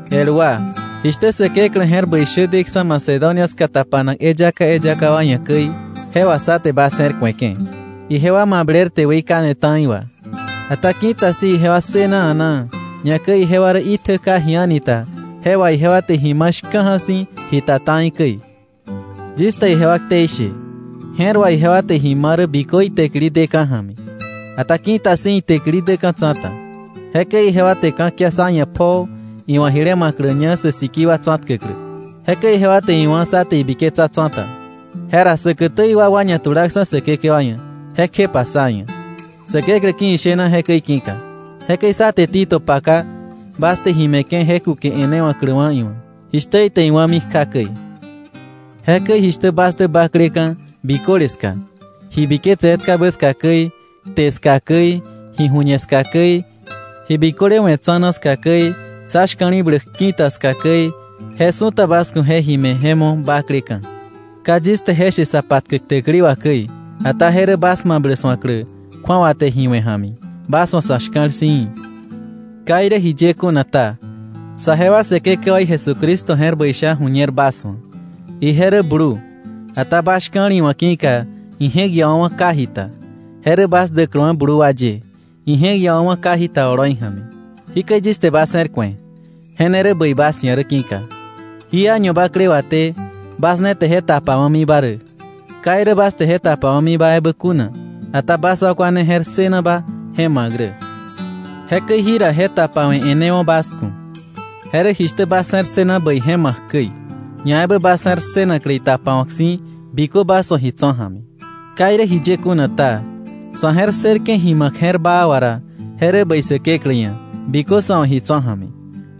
El wa, jishtä Säkeklä je̱r bäi shä deksa̱ Macedonia ska tapanak eyaka eyaka wa ia̱ käi, je wà sá te bas je̱r ku̱eke̱. Ijewa mablerte weikane ta̱i wà. Ata ki̱ta si̱ ijewa ssëna a̱naa, ñakäi ijewa rä itjä ka ji a̱ni ta, je wà ijewa te ji ma̱ shka̱ja̱ si̱ ji ta ta̱i käi. Yis te ijewa ktei she, je̱r wà ijewa te ji ma rä bikö itäkili deka̱ ja̱mi, ata ki̱ta si̱ itäkili däka̱ tsa̱ta. Jekäi ijewa te ka̱kia sá ia̱ pjoo iwa̱ jile ma̱kläña sä sikii wa tsa̱tkäklä. Jekäi ijewa te iwá̱ sá te ibiketsa tsa̱ta. Jera säkätä iwakwa ñatulaksa̱ Säkekewa ia̱, jekjepa sá ia̱, Säkeklä ki̱ ishena jekäi ki̱ka. Jekäi sá te Tito paka, bas te ji me̱ke̱ je kuke e̱newa̱kläwa̱ iwa̱, jishtä ite iwá̱mi kja käi. Jekäi jishtä bas dä bakleka̱ biköle ska, ji biketse etkabä ska käi, kte ska käi, ji ju̱ñe ska käi, ji biköle we̱ tsa̱na ska käi, sá shka̱li̱bläk ki̱ta ska käi, je su̱ta bas ku̱ je ji me̱ je mo̱ bakleka̱. Ka yis te je she sa patkäk täkili wà käi, ata je rä bas mablä su̱aklä kju̱awa te ji we̱ ja̱mi, bas wa̱ sa̱ shka̱l si̱ í̱. Ka irä jiye kuna ta, saje wa Säkekewaí Jesucristo je̱r bäi sha ju̱ñer bas wa̱. Ije rä blu, ata bas shka̱l iwa̱ ki̱ka ije̱k iawa̱wa̱ ka ji ta, je rä bas däkläwa̱ blu wa ye, ije̱k iawa̱wa̱ ka jita oloi ja̱mi. Jikäi yis te bas je̱r ku̱e, je ne rä bäi bas ia̱ rä ki̱ka. Jí año bakle waté bas ne te je tapawa̱miba rä, ka irä bas te je tapawa̱miba ebä kuna, ata bas wakwa ne je̱r ssënaba je ma̱k rä. Jekäi jira je tapawe̱ e̱newo̱ bas ku̱. Je rä jishtä bas je̱r ssëna bäi je ma̱k käi, ñaebä bas je̱r ssënaklä itapawa̱k si̱ bikö bas wa̱ ji tso̱ ja̱mi. Ka irä jiye kuna ta, sa̱ je̱r ssërke̱ ji ma̱k je̱r baa wà ra, je rä bäi Säkeklä ia̱ bikö sa̱ wa̱ ji tso̱ ja̱mi,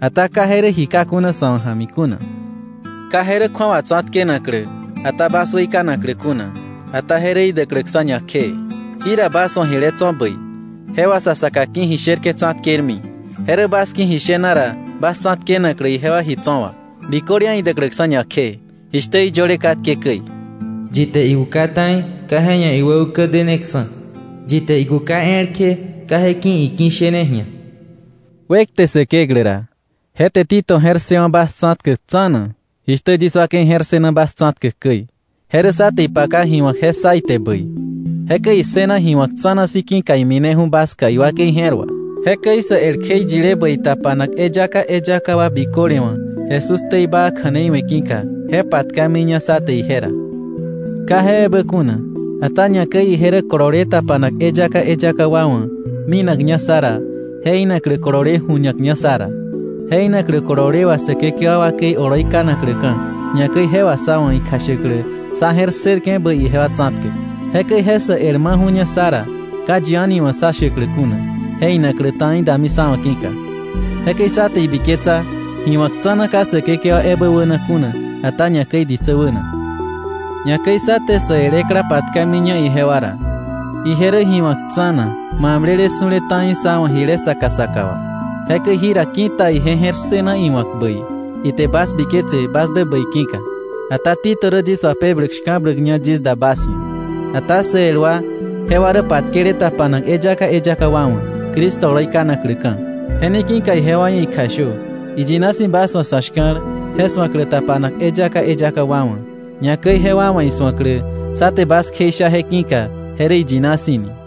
ata ka je rä ji ka kuna sa̱ wa̱ ja̱mi kuna. Ka je rä kju̱awa tsa̱tkenaklä, ata bas weikanaklä kuna, ata je rä idäkläksa̱ ñakjee. Jira bas wa̱ jile tso̱ bäi, je wà sa saka ki̱ ji sherke̱ tsa̱tkermi, je rä bas ki̱ ji shena ra, bas tsa̱tkenaklä ijewa ji tso̱ wà, biköle ia̱ idäkläksa̱ ñakjee, jishtä iyöle katke käi: “Yi te ikuka ta̱i ka je ia̱ iwä ukä deneksa̱, yi te ikuka elkje ka je ki̱ iki̱shene ji̱a.” Wekte Säkeklä ra, je te Tito je̱r ssëwa̱ bas tsa̱tkäk tsa̱na, jishtä yis wakei je̱r ssëna bas tsa̱tkäk käi. Je rä sá te ipaka ji wa̱k je ssa ite bäi. Jekäi issëna ji wa̱k tsa̱na si̱ ki̱ka imineju̱ bas ska iwakei je̱r wà. Jekäi sä el kjeiyile bäi tapanak eyaka eyaka wa biköle wa̱ Jesús ktei baa kja̱nei we̱ ki̱ka, je patkamiña sá te ije ra. Ka je ebä kuna. Ata ñakäi ije rä kolole tapanak eyaka eyaka wa wa̱ minakña sá ra je inaklä kolole ju̱ñakña sá ra, je inaklä kolole wà Säkekewa wakei oloi kanakläka̱, ñakäi je wà sá wa̱ ikjashäklä sá je̱r ssërke̱ bäi ijewa tsa̱tkäk. Jekäi je sä el maju̱ña sá ra ka yi a̱ni wa̱ sá shäklä kuna je inaklä ta̱i dami sá wa̱ ki̱ka. Jekäi sá te ibiketsa ji wa̱k tsa̱na ka Säkekewa ebä wäna kuna, ata ñakäi ditsä wäna. Ñakäi sá te sä el ekla patkamiña ijewa ra. Ije rä ji wa̱k tsa̱na, mablele su̱le ta̱i sá wa̱ jile saka saka wà. Jekäi jira ki̱ta ije je̱r ssëna iwa̱k bäi, ite bas biketse bas dä bäi ki̱ka. Ata Tito rä yis wapebläk shka̱bläkña yis da bas ia̱. Ata sä el wa, jewa rä patkele tapanak eyaka eyaka wa wa̱, Cristo oloi kanakläka̱. Je ne ki̱ka ijewa ia̱ ikjashö iyina si̱ bas wa̱ sa̱ shka̱l je su̱aklä tapanak eyaka eyaka wa wa̱, ñakäi jewa wa̱ isu̱aklä sá te bas kjeisha je ki̱ka je rä iyina si̱ ni.